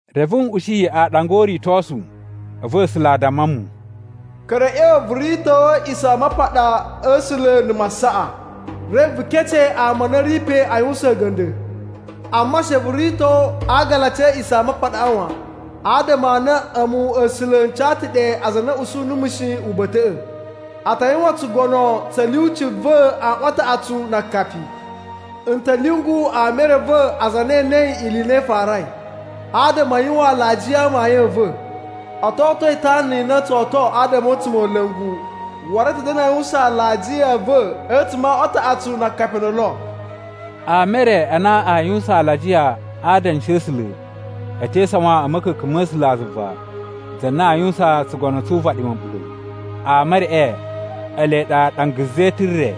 Reve n ushi aaɗanga o uritosu, a̱vu A̱sula̱ a damma mu, “Ka̱ra̱ a̱ ꞌya̱wa̱ vu rito A̱a̱ꞌisamapaɗa a̱ A̱sula̱ na̱ masaꞌa, reve vu kece ama a na a̱ ri pe a yuwusan a̱ga̱nda̱. Amma she vu rito agalaci a̱ A̱a̱ꞌisamapaɗaꞌa wan, adama a na a̱mu A̱sula̱ n ca ta̱ ɗe aza a na a̱ usu numu shi uba̱ta̱ꞌa̱. A ta yuwan tsugono tsa̱ lyuci va̱ aꞌwan a taꞌatsu na akapi. N ta̱ lyungu ama e re a̱ va̱, aza a na e enei ili i na i farai, adama a yuwan alajiya a amayun a̱ va̱. O to oto itana i na o tso oto adama a̱ a̱tsumola̱ngu waru a̱ ta̱ da̱na̱ a yuwusan alajiya a̱ va̱ a̱tsuma̱ a aꞌwan a taꞌatsu na akapi o ndolo.” Ama e re a na a yuwusan alajiya a adanshi a̱ A̱sula̱ e te isawan a̱ ma̱ka̱ka̱n ma̱ A̱sulazuva za na a yuwusan tsugono tsu uvaɗi ma̱ɓula̱. Ama e reꞌe ele ɗa ɗanga zetun re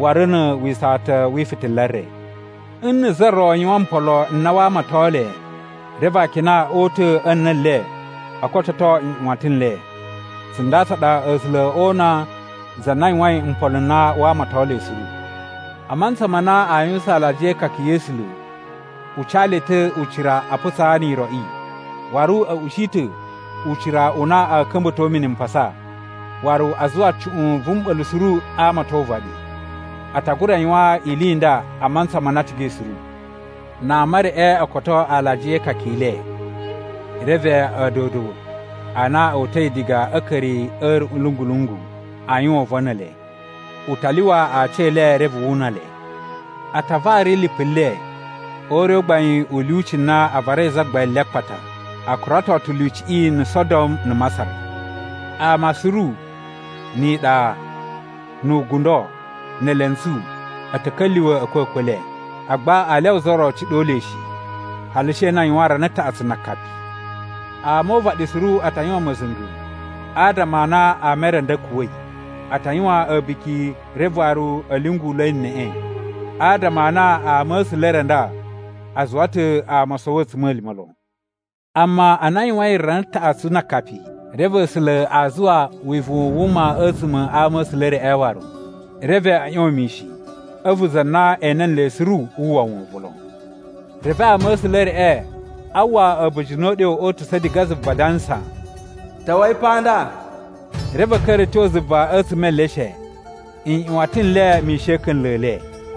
waru na̱ wisawatan wi ifitila re. Nna̱ za ro yuwan mpolo n na waa amaton le, reve akina o uta̱ a̱ na̱ le o kototo nꞌyuwatan n le. Tsunda tsa ɗa A̱sula̱ oo una za na yuwain mpolo n na waa amaton le suru. A mantsa ma na a yuwusan alajiya e ikaka ya̱ A̱sula̱, u ca le ta̱ ucira a putsaa ni iroꞌi. Waru a̱ ushi ta̱ ucira u na a̱ ka̱mba̱to mini mpasa, waru a zuwa cuꞌun vu mɓa̱la̱ suru a amaton uvaɗi. A ta gura yuwan ili i nda a mantsa ma na a cigai suru. Na ama e reꞌe o koto alajiya e ikaka i le, reve a̱a̱dodo a na o uta̱i diga a̱ a̱a̱ka̱ri a̱ a̱ruꞌun lungu-lungu a yuwan uvon ne ele. U ta lyuwa aci e le reve wu una le. A ta vari lipu le o ure u gbain u lyuci u na a varai Zagbain le a akpata. A kurato ta̱ lyuciꞌi na̱ Sodom na̱ Masar. Ama suru, ni iɗa, nu ugundo, ne elentsu, a̱ ta̱ ka̱lyuwa̱ a̱kwa̱kwa̱ e le. Agba aa lyawa za ro ciɗo le shi, hali she na a yuwan rana taꞌatsu na akapi. Ama o uvaɗi suru a ta yuwan ma̱za̱nga̱ adama a na ama e re a nda a̱ kuwa̱i. A ta yuwan a̱buki reve waru a̱ lyungula̱i neꞌe, adama a na ama̱sula̱ e re a nda a zuwa ta̱ ama o sowo a̱tsuma̱lima̱ lon. Amma ana a yuwain rana taꞌatsu na akapi, reve A̱sula̱ a zuwa wivuwun u wuma a̱tsuma̱ a ama̱sula̱ e reꞌe waru. Reve a̱ ꞌyon mishin, a̱vu za na ene nle suru wu uwwa wovon lon. Reve ama̱sula̱ e reꞌe a uwwa a̱ba̱jini o uɗyo o utusa̱ diga zuva adansa, “Ta̱wa̱i pa nda!” Reve a̱ ka̱ra̱ a̱ tyo zuva a̱tsuma̱ e eleshe, nꞌyuwatan n le mishin a̱ a̱ka̱nla̱ e le.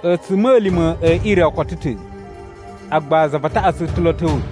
A̱tsuma̱lima̱ e ire o koto ta̱, agba za va taꞌatsu ta̱ lo a̱ ta̱wa̱.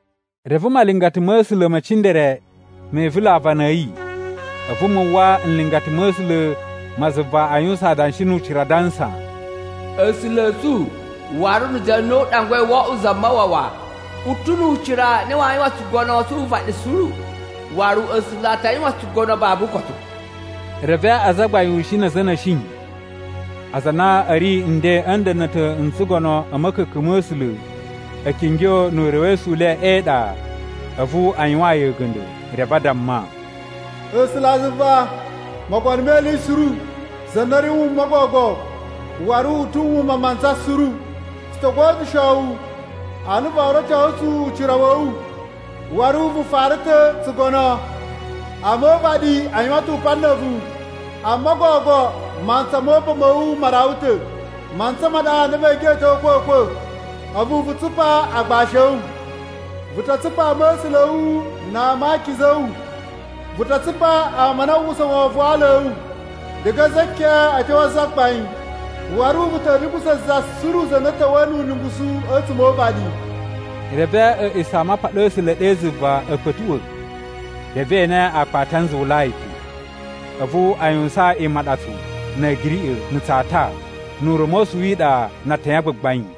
Reve malingata ma̱ A̱sula̱ me cindere me ivula̱ aavana a̱ yi, a̱vu mu uwwa nlingata ma̱ A̱sula̱ ma zuva a yuwusan adanshi nu ucira adansa, “A̱sula̱ a̱ tsu waru na̱ za na u ɗangwai wo oꞌwo Zamawawa u ta̱ nu ucira u na waa yuwan tsugono tsu uvaɗi suru, waru A̱sula̱ a ta yuwan tsugono babu ukotu.” Reve azagbain ushin na̱ a̱za̱ a̱ na̱shi, aza a na a̱ ri nden a̱ nda̱na̱ta̱ n tsugono a̱ ma̱ka̱ka̱n ma̱ A̱sula̱ a̱ kingyo nu urewesu u le e iɗa a̱vu a yuwaan yi a̱ga̱nda̱. Reve a damma, “A̱sulazuva Mogono me Ili Suru, za na ri wuma gogo, waru u ta̱ wuma mantsa suru, tsu to godyusho wu a na voo rocosu tsu ucira wa̱ wu, waru vu fara ta̱ tsugono. Ama o uvaɗi a yuwan ta̱ upan na̱ a̱vu, amma gogo mantsa mo upan ma̱ wu ma rawa ta̱. Mantsa ma ɗa na vee geꞌeto a̱kwa̱kwa̱, a̱vu vu tsupa agbashi a̱ wu. Vu ta tsupa ama̱sula̱ a̱ wu na ama a akiza a̱ wu, vu ta tsupa ama a na a uwwusa wovon wa ala a̱ wu, diga a za keꞌen a̱ tyo a zagbain. Waru vu ta̱ lungusa̱ za suru na ta̱wa̱yi nu ulungusu a̱tsuma̱ o uvaɗi.” Reve A̱a̱ꞌisamapaɗa a̱ A̱sula̱ ɗe zuva a̱ kpa̱tuꞌwa̱, reve e ene Akpati a Nzuwulai pe. A̱vu a yuwusan imaɗatsu, na̱ a̱giriꞌa̱, na̱ tsata, nu ura̱mosu wi iɗa na atayan a gbagbain.